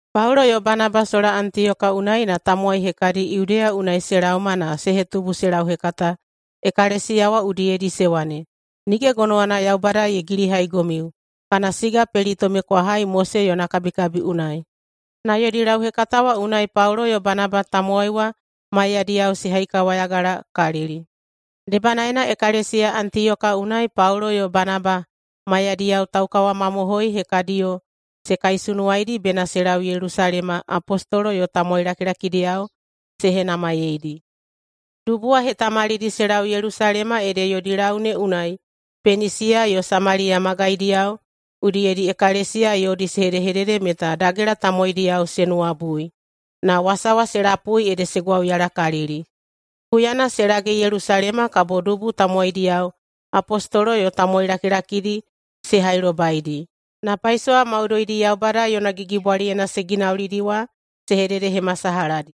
Paulo yo Banaba sola Antiyoka unai na tamowai hekadi Yudeya unai se laoma na se hetubu se lauhekata ekalesiya wa udiyedi se wane, “Nige gonowana Yaubada ye gilihaigomiu kana siga pelitome kwa hai Mose yona kabikabi unai.” Na yodi lauhekata wa unai Paulo yo Banaba tamowai wa maiyadiyao se haikawayagalakalili. Debanaena ekalesiya Antiyoka unai Paulo yo Banaba maiyadiyao taukawamamohoi hekadiyo se kaisunuwaidi bena se lau Yelusalema apostolo yo tamowai lakilakidiyao se henamaiyeidi. Dubu wa ye hetamalidi se lau Yelusalema ede yodi lau ne unai Penisiya yo Samaliya magaidiyao udiyedi ekalesiya yodi se hedehedede meta dagela tamowaidiyao se nuwabui. Na wasa wa se lapui ede se gwauyalakalili. Huyana se lage Yelusalema kabo dubu tamowaidiyao, apostolo yo tamowai lakilakidi se hailobaidi, na paisowa maudoidi Yaubada yona gigibwaliyena se ginaulidi wa se hededehemasalahadi.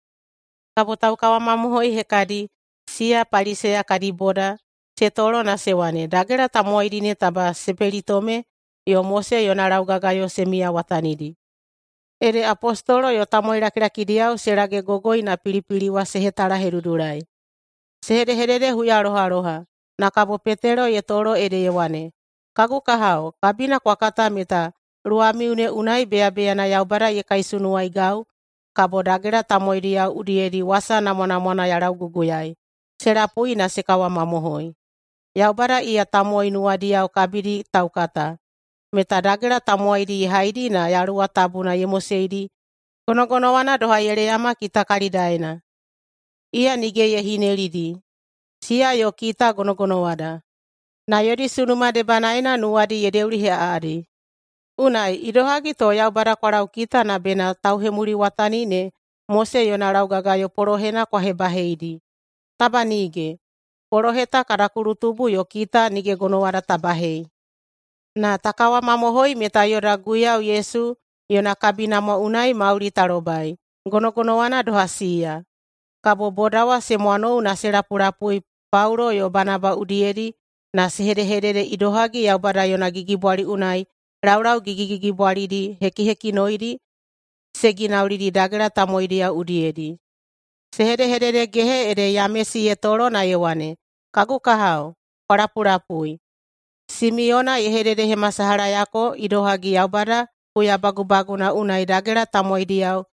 Kabo taukawamamohoi hekadi, siya Paliseya kadi boda, se tolo na se wane, “Dagela tamowaidi ne taba se pelitome yo Mose yona laugagayo se miyawatanidi.” Ede apostolo yo tamowai lakilakidiyao se lagegogoi na pilipili wa se hetalahedudulai. Se hedehedede huyalohaloha, na kabo Petelo ye tolo ede ye wane, “Kagu kahao, kabina kwa kata meta luwamiu ne unai beyabeyana Yaubada ye kaisunuwaigau kabo dagela tamowaidiyao udiyedi wasa namwanamwana ya lauguguyaei se lapui na se kawamamohoi. Yaubada, iya tamowai nuwadiyao kabidi taukata, meta dagela tamowaidi ye haidi na Yaluwa Tabuna ye moseidi gonogonowana doha ye leyama kita kalidaena. Iya nige ye hinelidi, siya yo kita gonogonowada. Na yodi sunuma debanaena nuwadi ye deuliheꞌaꞌadi. Unai, idohagi to Yaubada kwa laukita na bena tauhemuliwatani ne Mose yona laugagayo polohena kwa hebaheidi? Taba nige! Polohe ta kada kulutubu yo kita nige gonowada ta bahei. Na ta kawamamohoi meta yoda Guiyau Yesu yona kabinamwa unai mauli ta lobai, gonogonowana doha siya.” Kabo boda wa se mwanou na se lapulapui Paulo yo Banaba udiyedi na se hedehedede idohagi Yaubada yona gigibwali unai laulau gigigigibwalidi hekihekinoidi se ginaulidi dagela tamowaidiyao udiyedi. Se hedehededegehe ede Yamesi ye tolo na ye wane, “Kagu kahao, kwa lapulapui. Simiyona ye hededehemasalahayako idohagi Yaubada huya bagubagunana unai dagela tamowaidiyao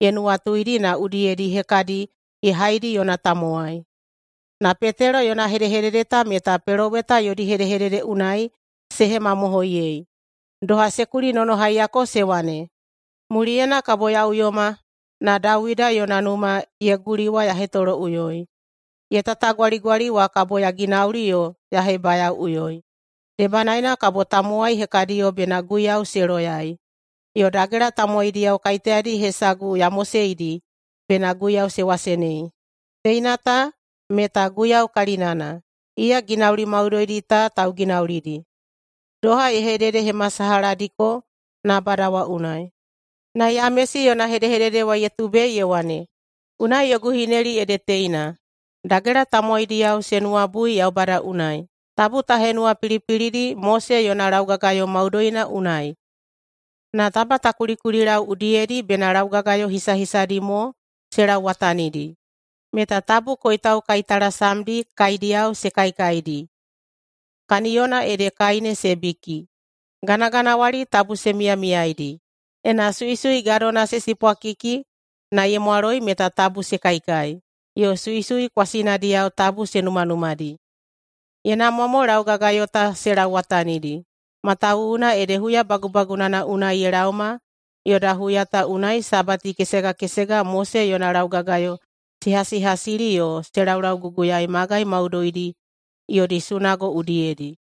ye nuwatuidi na udiyedi hekadi ye haidi yona tamowai. Na Petelo yona hedehedede ta meta peloweta yodi hedehedede unai se hemamohoiyei, doha se kulinonohaiyako se wane, ‘Muliyena kabo ya uyoma na Dawida yona numa ye guli wa ya hetoloꞌuyoi. Ye tatagwaligwali wa kabo ya ginauli yo ya hebayaoꞌuyoi. Debanaena kabo tamowai hekadiyo bena Guiyau se loyai, yo dagela tamowaidiyao kaiteyadi hesagu ya moseidi bena Guiyau se wasenei. Teina ta meta Guiyau kalinana. Iya ginauli maudoidi ta tauginaulidi, doha ye hededehemasalahadiko nabada wa unai.’” [Na Yamesi yona hedehedede wa ye tubei ye wane,] “Unai yogu hineli ede teina: Dagela tamowaidiyao se nuwabui Yaubada unai, tabu ta henuwapilipilidi Mose yona laugagayo maudoina unai. Na taba ta kulikulilau udiyedi bena laugagayo hisahisadi mo se lauwatanidi, meta tabu koitau kaitalasamdi kaidiyao se kaikaidi kaniyona ede kai ne se biki, ganaganawali tabu se miyamiyaedi, ena suisui gadona se sipwakiki na ye mwaloi meta tabu se kaikai, yo suisui kwasinadiyao tabu se numanumadi. Ye namwa mo laugagayo ta se lauwatanidi, matawuwuna ede huya bagubagunana unai ye laoma yoda huya ta unai Sabati kesega kesega Mose yona laugagayo se hasihasili yo se lauguguyaei magai maudoidi yodi sunago udiyedi.”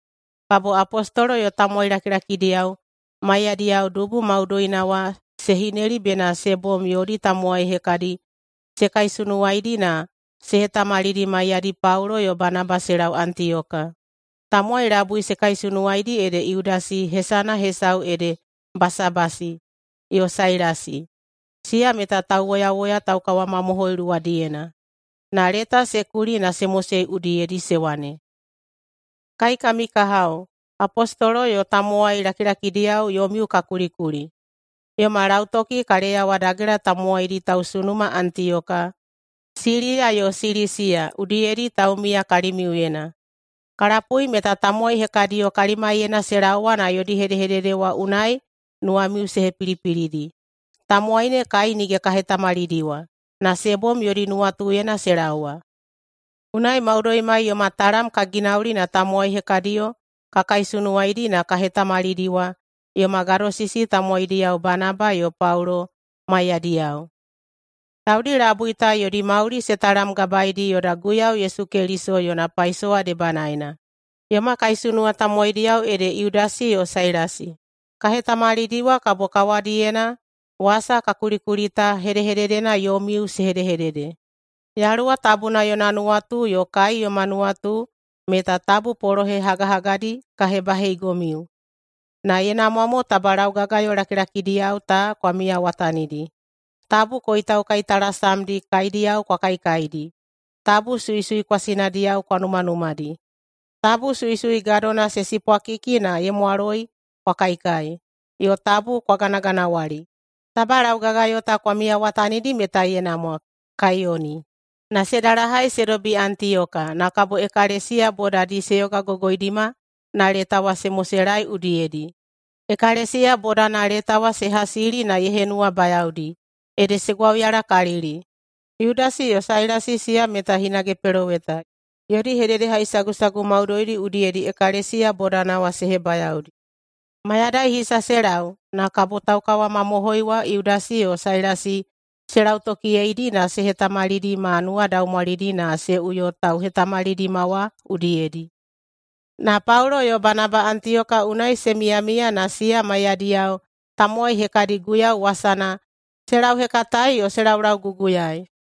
Kabo apostolo yo tamowai lakilakidiyao maiyadiyao dubu maudoina wa se hineli bena se bom yodi tamowai hekadi se kaisunuwaidi na se hetamalidi maiyadi Paulo yo Banaba se lau Antiyoka. Tamowai labui se kaisunuwaidi ede Yudasi (hesana hesau ede Basabasi) yo Sailasi, siya meta tauwoyawoya taukawamamohoi luwadiyena. Na leta se kuli na se mosei udiyedi, se wane, “Kai kami kahao apostolo yo tamowai lakilakidiyao yomiu ka kulikuli. Yoma lautoki ka leyawa dagela tamowaidi tausunuma Antiyoka, Siliya yo Silisiya udiyedi taumiya kalimiuyena. Ka lapui meta tamowai hekadiyo kalimaiyena se laowa na yodi hedehedede wa unai nuwamiu se hepilipilidi. Tamowai ne kai nige ka hetamalidiwa, na se bom yodi nuwatuyena se laowa. Unai maudoimai yoma talam ka ginauli na tamowai hekadiyo ka kaisunuwaidi na ka hetamalidiwa yoma gadosisi tamowaidiyao Banaba yo Paulo maiyadiyao. Taudi labui ta yodi mauli se talamgabaeidi yoda Guiyau Yesu Keliso yona paisowa debanaena. Yoma kaisunuwa tamowaidiyao ede Yudasi yo Sailasi. Ka hetamalidiwa kabo kawadiyena wasa ka kulikuli ta hedehededena yomiu se hedehedede. Yaluwa Tabuna yona nuwatu yo kai yoma nuwatu meta tabu polohe hagahagadi ka hebahebaheigomiu, na ye namwa mo taba laugagayo lakilakidiyao ta kwa miyawatanidi: Tabu koitau kaitalasamdi kaidiyao kwa kaikaidi, tabu suisui kwasinadiyao kwa numanumadi, tabu suisui gadona se sipwakiki na ye mwaloi kwa kaikai, yo tabu kwa ganaganawali. Taba laugagayo ta kwa miyawatanidi meta ye namwa. Kaiyoni.” Na se dalahai se dobi Antiyoka, na kabo ekalesiya bodadi se yogagogoidima na leta wa se moselaei udiyedi. Ekalesiya bodana leta wa se hasili na ye henuwabayaodi, ede se gwauyalakalili. Yudasi yo Sailasi siya meta hinage peloweta. Yodi hededehaisagusagu maudoidi udiyedi ekalesiya bodana wa se hebayaodi. Mayadai hisa se lau, na kabo taukawamamohoi wa Yudasi yo Sailasi se lautokiyeidi na se hetamalidi ma nuwadaumwalidi na se uyo tauhetamalidima wa udiyedi. Na Paulo yo Banaba Antiyoka unai se miyamiya na siya maiyadiyao tamowai hekadi Guiyau wasana se lauhekataei yo se laulauguguyaei.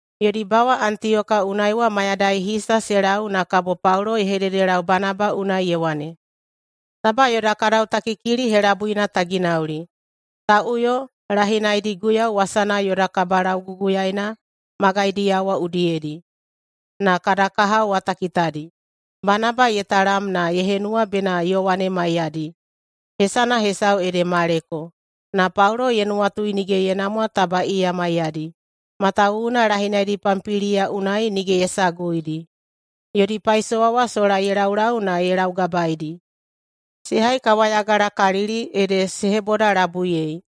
Yodi bawa Antiyoka unai wa mayadai hisa se lau na kabo Paulo ye hededelau Banaba unai ye wane, “Taba yoda kadautakikili helabuina ta ginauli. Ta uyo lahinaidi Guiyau wasana yoda kabalauguguyaena magaidiyao wa udiyedi, na kada kahao wa ta kitadi.” Banaba ye talam na ye henuwa bena Yowane maiyadi, hesana hesau ede Maleko. Na Paulo ye nuwatui nige ye namwa taba iya maiyadi, matawuwuna lahinaidi Pampiliya unai nige ye saguidi, yodi paisowa wa sola ye laulau na ye laugabaeidi. Se haikawayagalakalili ede se hebodalabuiyei.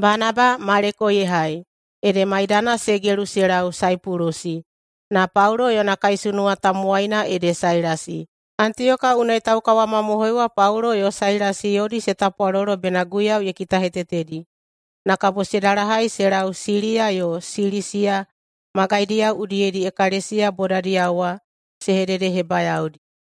Banaba Maleko ye hai, ede maidana se gelu se lau Saipulusi, na Paulo yona kaisunuwa tamowaina ede Sailasi. Antiyoka unai taukawamamohoi wa Paulo yo Sailasi yodi se tapwalolo bena Guiyau ye kitahetetedi, na kabo se dalahai se lau Siliya yo Silisiya magaidiyao udiyedi ekalesiya bodadiyao wa se hededehebayaodi.